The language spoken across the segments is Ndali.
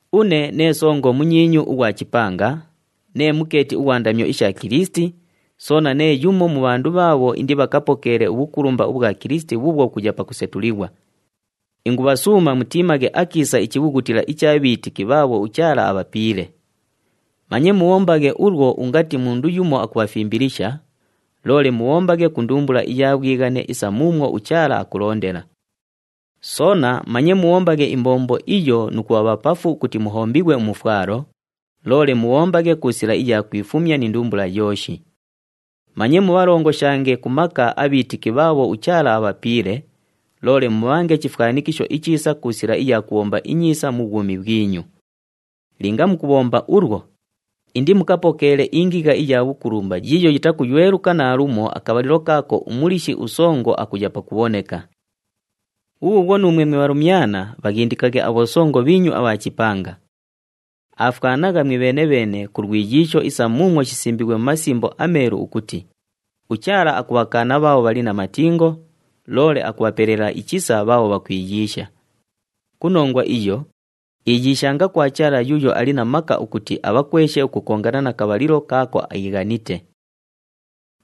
Une nee songo munyiinyu ughwa chipanga, nee mukeeti ughwa ndamyo isha Kilisiti, soona nee yumo mu bhandu bhaabho indibhakapokeele ubhukulumba ubhwa Kilisiti bhuubhwo bhukuya pakusetulighwa. Ingubhasuuma mutiimaghe akiisa ichibhughutila icha bhiitiki bhaabho uChaala abhapiile. Manye mubhombaghe ulwo ungati mundu yumo akubhafimbilisha, loole mubhombaghe ku ndumbula iya bhwighane isa muumwo uChaala akulondela. Soona manye mubhombaghe imbombo iyo nu kubha bhapafu ukuti muhombighwe umufwalo, loole mubhombaghe ku sila iya kwifumya ni ndumbula yooshi. Manye mubhalongoshange ku maka abhiitiki bhaabho uChaala abhapiile, loole mubhange chifwanikisho ichiisa ku sila iya kubhomba inyiisa mu bhwumi bhwinyu. Linga mukubhomba ulwo, indimukapokeele ingigha iya bhukulumba yiiyo yitakuyweluka naalumo akabhalilo kaako uMuliishi uSongo akuya pakubhoneka. Bhubhuubhwo nuumwe mwe bhalumyana, bhaghindikaghe abhosongo bhiinyu abha chipanga. Aafwanagha mwibheene-bheene ku lwiyiisho isa muumwo shisimbiighwe mu Masimbo aMeelu ukuti, “UChaala akubhakaana bhaabho bhali na matingo, loole akubhapelela ichisa bhaabho bhakwiyiisha.” Ku nongwa iyo, iyiishanga kwa Chaala yuuyo ali na maka ukuti abhakweshe ukukongana na kabhalilo kaako iighanite.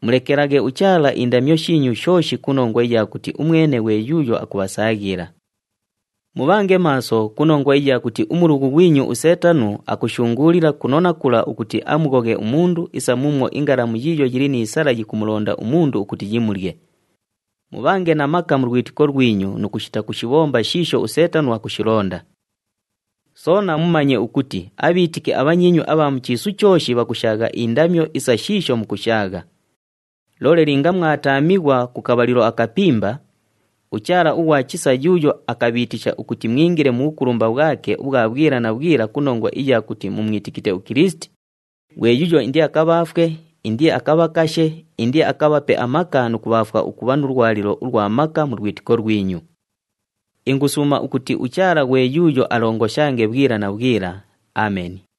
Mulekelaghe uChaala indamyo shiinyu shooshi ku nongwa iya kuti umwene ghwe yuuyo akubhasaaghila. Mubhange maaso ku nongwa iya kuti umulughu ghwinyu uSeetano akushunguulila kuno na kula ukuti amughoghe umundu isa muumwo ingalamu yiiyo yili ni sala yikumulonda umundu ukuti yimulye. Mubhange na maka mu lwitiko lwinyu nu kushita kushibhomba shiisho uSeetano akushilonda. Soona mumanye ukuti abhiitiki abhanyiinyu abha mu chiisu chooshi bhakushaagha indamyo isa shiisho mukushaagha. Loole linga mwataamighwa ku kabhalilo akapimba, uChaala ughwa chisa yuuyo akabhiitisha ukuti mwingile mu bhukulumba bhwake ubhwa bhwila na bhwila ku nongwa iya kuti mumwitikite uKilisiti, ghwe yuuyo indiakabhaafwe, indiakabhakashe, indiakabhape amaka nu kubhaafwa ukubha nu lwalilo ulwa maka mu lwitiko lwinyu. Ingusuuma ukuti uChaala ghwe yuuyo alongoshange bhwila na bhwila. Ameni.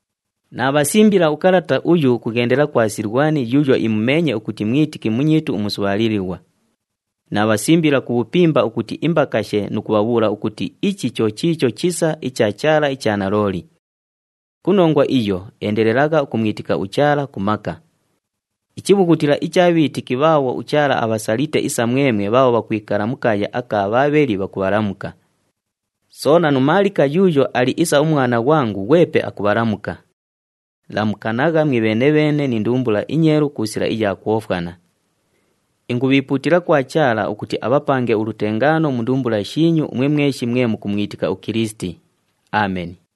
Naabhasimbila ukalata uyu ukughendela kwa Silwani yuuyo imumeenye ukuti mwitiki munyiitu umusubhaalilighwa. Naabhasimbila ku bhupimba ukuti imbakashe nu kubhabhuula ukuti ichi cho chiicho chisa icha Chaala icha nalooli. Ku nongwa iyo endelelagha ukumwitika uChaala ku maka. Ichibhughutila icha bhiitiki bhaabho uChaala abhasalite isa mwemwe bhaabho bhakwikala mu kaaya aka Bhaabheli bhakubhalamuka. Soona nu Maalika yuuyo ali isa umwana ghwangu, ghwepe akubhalamuka. Lamukanagha mwibheene-bheene ni ndumbula inyeelu ku sila iya kwofwana. Ingubhiipuutila kwa Chaala ukuti abhapange ulutengaano mu ndumbula shiinyu umwe mweshi mwe mukumwitika uKilisiti. Ameni.